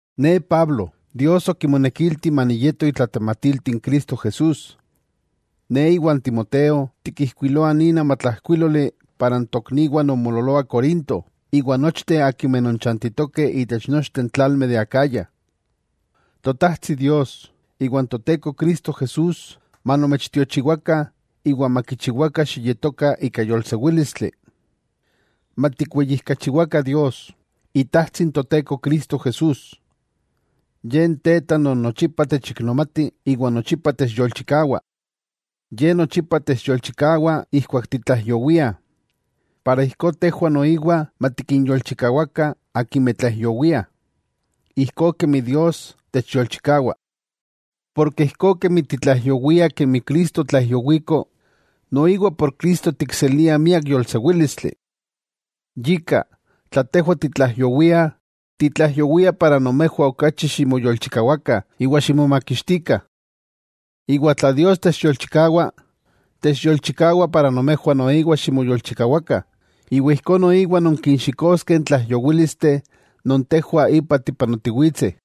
Ne Pablo, Dios okimonekilti maniyeto itlatematilti n Cristo Jesús. Ne iwan Timoteo tikijkuiloah nin amatlajkuíloli para n tokniwah non moololoah Corinto iwa nochteh akimeh nonchantitokeh itech nochteh n tlalmeh de Acaya. Totajtsi Dios iwan Toteko Cristo Jesús manomechtiochiwakah iwa makichiwakah xiyetokah ika yolsewílistli. Matikweyijkachiwakah Dios, Itajtsi n Toteko Cristo Jesús. Ye n Teta non nochipa techiknomati iwa nochipa techyolchikawa. Ye nochipa techyolchikawa ijkuak titlaijyowiah, para ijkó tejwah noiwa matikinyolchikawakah akimeh tlaijyowiah, ijkó kemi Dios techyolchikawa. Porke ijkó kemi titlaijyowiah kemi Cristo otlaijyowiko, noiwa por Cristo tikseliah miak yolsewílistli. Yika, tla tejwah titlaijyowiah, titlaijyowiah para nomejwah okachi ximoyolchikawakah iwa ximomakixtikah. Iwa tla Dios techyolchikawa, techyolchikawa para nomejwah noiwa ximoyolchikawakah, iwa ijkó noiwa nonkinxikoskeh n tlaijyowílisteh non tejwah ipa tipanotiwitseh.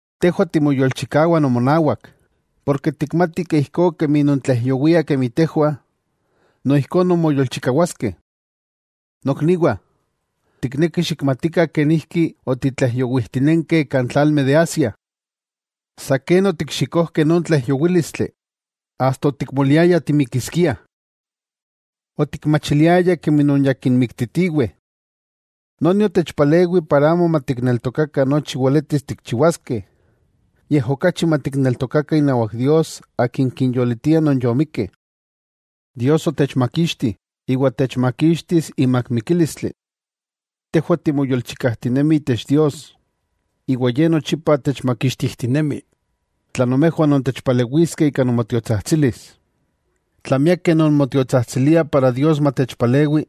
Tejwah timoyolchikawah nomonawak, porke tikmatih ijkó kemi nontlaijyowiah kemi tejwah, noijkó nonmoyolchikawaskeh. Nokniwah, tiknekih xikmatikah kenijki otitlaijyowijtinenkeh kan tlalmeh de Asia. Sa ken otikxikojkeh non tlaijyowílistli, asta otikmoliayah timikiskiah. Otikmachiliayah kemi non ya kinmiktitiweh. Noni otechpalewi para amo matikneltokakah nochi weletis tikchiwaskeh, yej okachi matitlaneltokakah inawak Dios Akin kinyolitia non yomikkeh. Dios otechmakixti, iwa techmakixtis imak mikílistli. Tejwah timoyolchikajtinemih itech Dios, iwa Ye nochipa techmakixtijtinemi, tla nomejwah nontechpalewiskeh ika nomotiotsajtsilis. Tla miakeh non motiotsajtsiliah para Dios matechpalewi,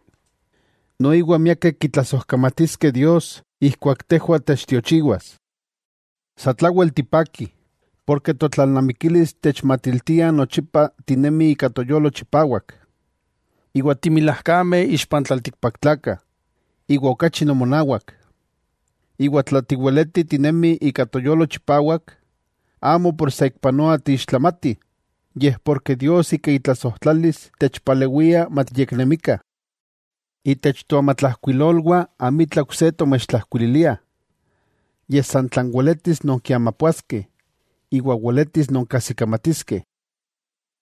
noiwa miakeh kitlasojkamatiskeh Dios ijkuak tejwah techtiochiwas. Satlawel tipakih, porke totlalnamikilis techmatiltia nochipa tinemih ika toyolo chipawak, iwa timilajkameh ixpa n tlaltikpaktlakah, iwa okachi nomonawak. Iwa tla tiweletih tinemih ika toyolo chipawak, amo por saikpanoa ti ixtlamatih, yej porke Dios ika itlasojtlalis techpalewia matiyeknemikah. Itech toamatlajkuilolwah amitla ok se tomechtlajkuililiah, yej san tlan weletis nonkiamapoaskeh iwa weletis nonkajsikamatiskeh.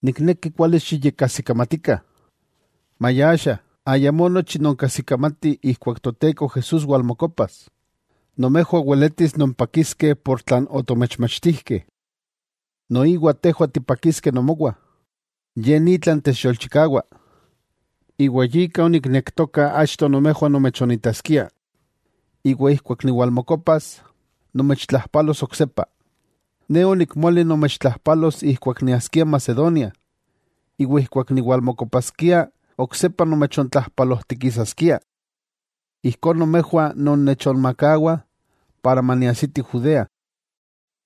Nikneki kuali xikyekajsikamatikah. Maya axa, ayamó nochi nonkajsikamatih ijkuak Toteko Jesús walmokopas, nomejwah weletis nompakiskeh por tlan otomechmachtijkeh. Noiwa tejwah tipakiskeh nomowah. Ye ni tlan nechyolchikawa, iwa yika oniknektoka achto nomejwah nomechonitaskia, iwa ijkuak niwalmokopas, nomechtlajpalos oksepa. Ne onikmoli nomechontlajpalos ijkuak niaskia Macedonia, iwa ijkuak niwalmokopaskia oksepa nomechontlajpalojtikisaskia. Ijkó nomejwah nonnechonmakawah para maniajsiti Judea.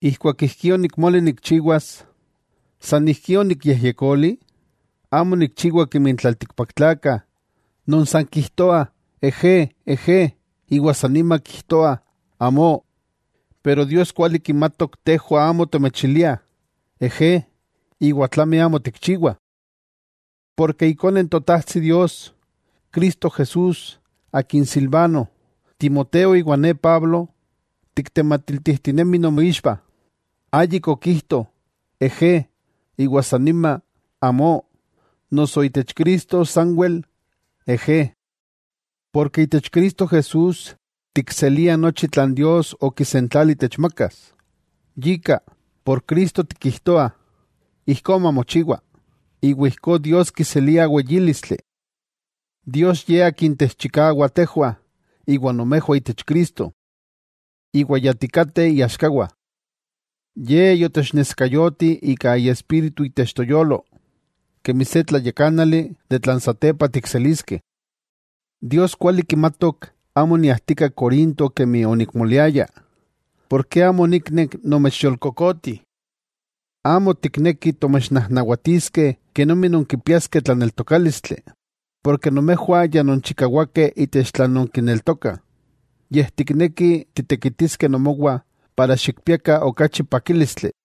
Ijkuak ijkí onikmoli nikchiwas, ¿san ijkí onikyejyekoli? Amo nikchiwa kemi n tlaltikpaktlakah non san kijtoah ejé, ejé; iwa san nima kijtoah, amó. Pero Dios kuali kimatok tejwah amo tomechiliah “ejé” iwa tlami amo tikchiwah. Porke Ikone n Totajtsi Dios, Cristo Jesús akin Silvano, Timoteo iwa ne Pablo tiktematiltijtinemih nomoixpa, ayik okijto “ejé” iwa san nima “amó”, yej nochipa “ejé”. Porke itech Cristo Jesús tikseliah nochi tlan Dios okisentlali techmakas. Yika, por Cristo tikijtoah “ijkó mamochiwa”; iwa ijkó Dios kiselia weyílistli. Dios Ye Akin techchikawa tejwah iwa nomejwah itech Cristo. Iwa ya tikateh iaxkawah. Ye yotechneskayoti ika Iespíritu itech toyolo, kemi se tlayakánali tlan satepa tikseliskeh. Dios kuali kimatok amo niajtika Corinto kemi onikmoliaya, porke amo oniknek nomechyolkokoti. Amo tiknekih tomechnajnawatiskeh kenomi nonkipiaskeh tlaneltokálistli, porke nomejwah ya nonchikawakeh itech tlan nonkineltokah, yej tiknekih titekitiskeh nomowah para xikpiakah okachi pakílistli.